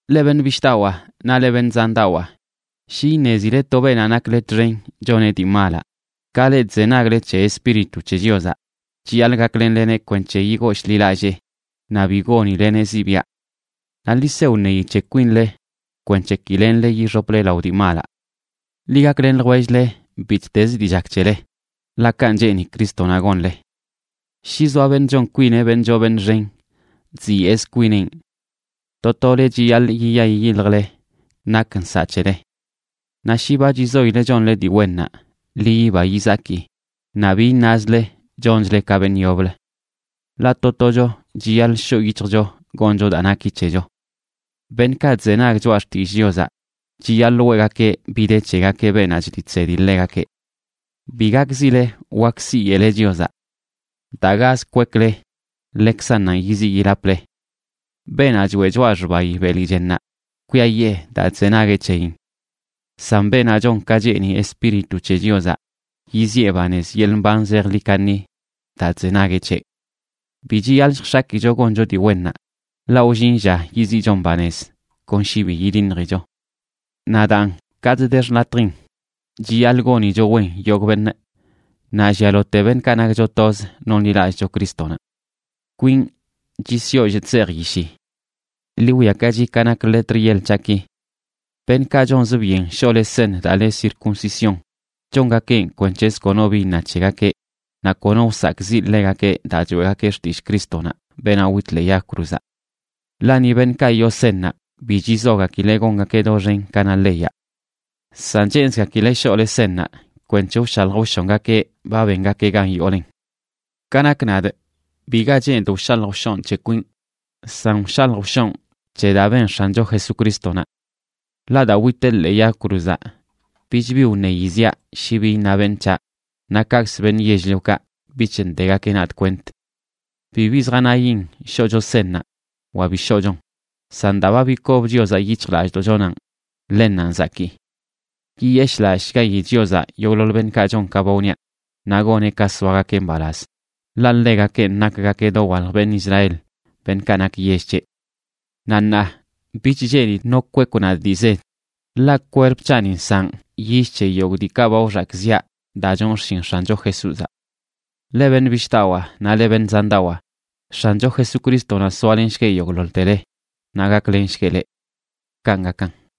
Leꞌ beṉꞌ bishꞌdawaa naꞌ leꞌ beṉꞌ zandawaa, shi iṉezile to beenaꞌ nakle txen choneꞌ dii malaꞌ, ka leꞌ chzenagle c̱he Espíritu c̱he Chiozaꞌ chiyaḻꞌ gaklenleneꞌ kwenc̱he yigooshḻilallee, naꞌ bi gonileneꞌ ziꞌbiaꞌ. Naꞌ ḻi se wṉeyi c̱he kwinle kwenc̱he ki lenle yixople lao dii malaꞌ. Ḻi gaklen ljwell-le bittezə dii chak c̱hele, ḻaꞌ kanꞌ cheeni Crístonaꞌ gonle. Shi zoa beṉꞌ chon kwineꞌ beṉꞌ choo beṉꞌ xen, chziyeꞌz kwinenꞌ. To tole chiyaḻꞌ yiya yiyiljle nak nsaꞌ c̱hele. Naꞌ shi ba chizoile chonle dii wennaꞌ, ḻi yiba yizaki, naꞌ bi iṉazle chonchle ka beṉꞌ yoblə. Ḻaꞌ to tocho chiyaḻꞌ shoꞌ yic̱hjcho goncho daa naki c̱hecho. Beṉꞌkaꞌ chzenag choꞌa xtillꞌ Chiozaꞌ chiyaḻꞌ weꞌgakeꞌ bi de c̱hegakeꞌ beenaꞌ chliꞌ chsedi ḻegakeꞌ. Bi gakzile wak siyeꞌle Chiozaꞌ. Daa gaz kwekle ḻekzannanꞌ yiziꞌ yilaple. Beenaꞌ choeꞌ choꞌa xbayi beli chennaꞌ, kwiayee daa chzenagueꞌ c̱heyin. San beenaꞌ chon ka cheeni Espíritu c̱he Chiozaꞌ, yiziꞌe banez yeḻꞌ mban zejḻi kaṉi daa chzenagueꞌ c̱heꞌ. Bi chiyaḻꞌ lljx̱akicho goncho dii wennaꞌ, ḻaꞌ wllin lla yiziꞌchon banez kon shi bi yidiṉjicho. Naꞌ daan, katꞌ de xḻatjin, chiyaḻꞌ gonicho wen yogꞌ beṉꞌ, naꞌ llialote beṉꞌkaꞌ nakcho toz nonḻilallꞌcho Crístonaꞌ. Kwinꞌ chisyollꞌ chzejꞌ yishi.a Ḻi wwiakachi ka nak letr yeḻ c̱haꞌki. Beṉꞌkaꞌ chonzə byen shoꞌle seṉ daa le circuncisión, chongakeꞌn kwenc̱hzə kono bi iṉa c̱hegakeꞌ, naꞌ kono wsakꞌziꞌ ḻegakeꞌ daa choeꞌgakeꞌ xtillꞌ Crístonaꞌ, beenaꞌ wit ḻee yag cruzaꞌ. Ḻaꞌ ni beṉꞌkaꞌ yoo seṉnaꞌ bi chizogakileꞌ gongakeꞌ doxen ka na leyaꞌ. San cheenzgakileꞌ shoꞌle seṉnaꞌ kwenc̱he wshalj wshongakeꞌ ba bengakeꞌ gan yoolen. Ka nak nadꞌ, biga cheenidꞌ wshalj wshonꞌ c̱he kwinꞌ, san wshalj wshonꞌ c̱he daa ben X̱ancho Jesucrístonaꞌ. Ḻaꞌ daa witeꞌ ḻee yag cruzaꞌ bich bi wṉeyi ziaꞌ shi bi iṉa beṉꞌ c̱haꞌ, naꞌ kaꞌkzə beṉꞌ yell-liokaꞌ bich ndegakeꞌ nadꞌ kwent. Bibi zjanayin shoꞌcho seṉnaꞌ wa bi shoꞌchon, san daa ba bikob Chiozaꞌ yic̱hjlallꞌdoꞌchonanꞌ, ḻennanꞌ zakii. Yiyeshꞌlallꞌshgayi Chiozaꞌ yogꞌḻoḻ beṉꞌkaꞌ chon ka ba wniaꞌ, naꞌ goneꞌ ka soagakeꞌ mbalaz, ḻaꞌ ḻegakenꞌ nakgakeꞌ dowalj beṉꞌ Israel, beṉꞌkaꞌ nak yell c̱heꞌ. Naꞌ ṉaa, bich cheenidꞌ no kwekw nadꞌ dii zed, ḻaꞌ kwerp c̱haꞌni nsaꞌn yill c̱he yogꞌ diikaꞌ ba wxakꞌziꞌa daa chon xshin X̱ancho Jesúzaꞌ. Leꞌ beṉꞌ bishꞌdawaa naꞌ leꞌ beṉꞌ zandawaa, X̱ancho Jesucrístonaꞌ soalenshgueꞌ yogꞌḻoḻtele naꞌ gaklenshgueꞌ leꞌ. Kanꞌ gakan.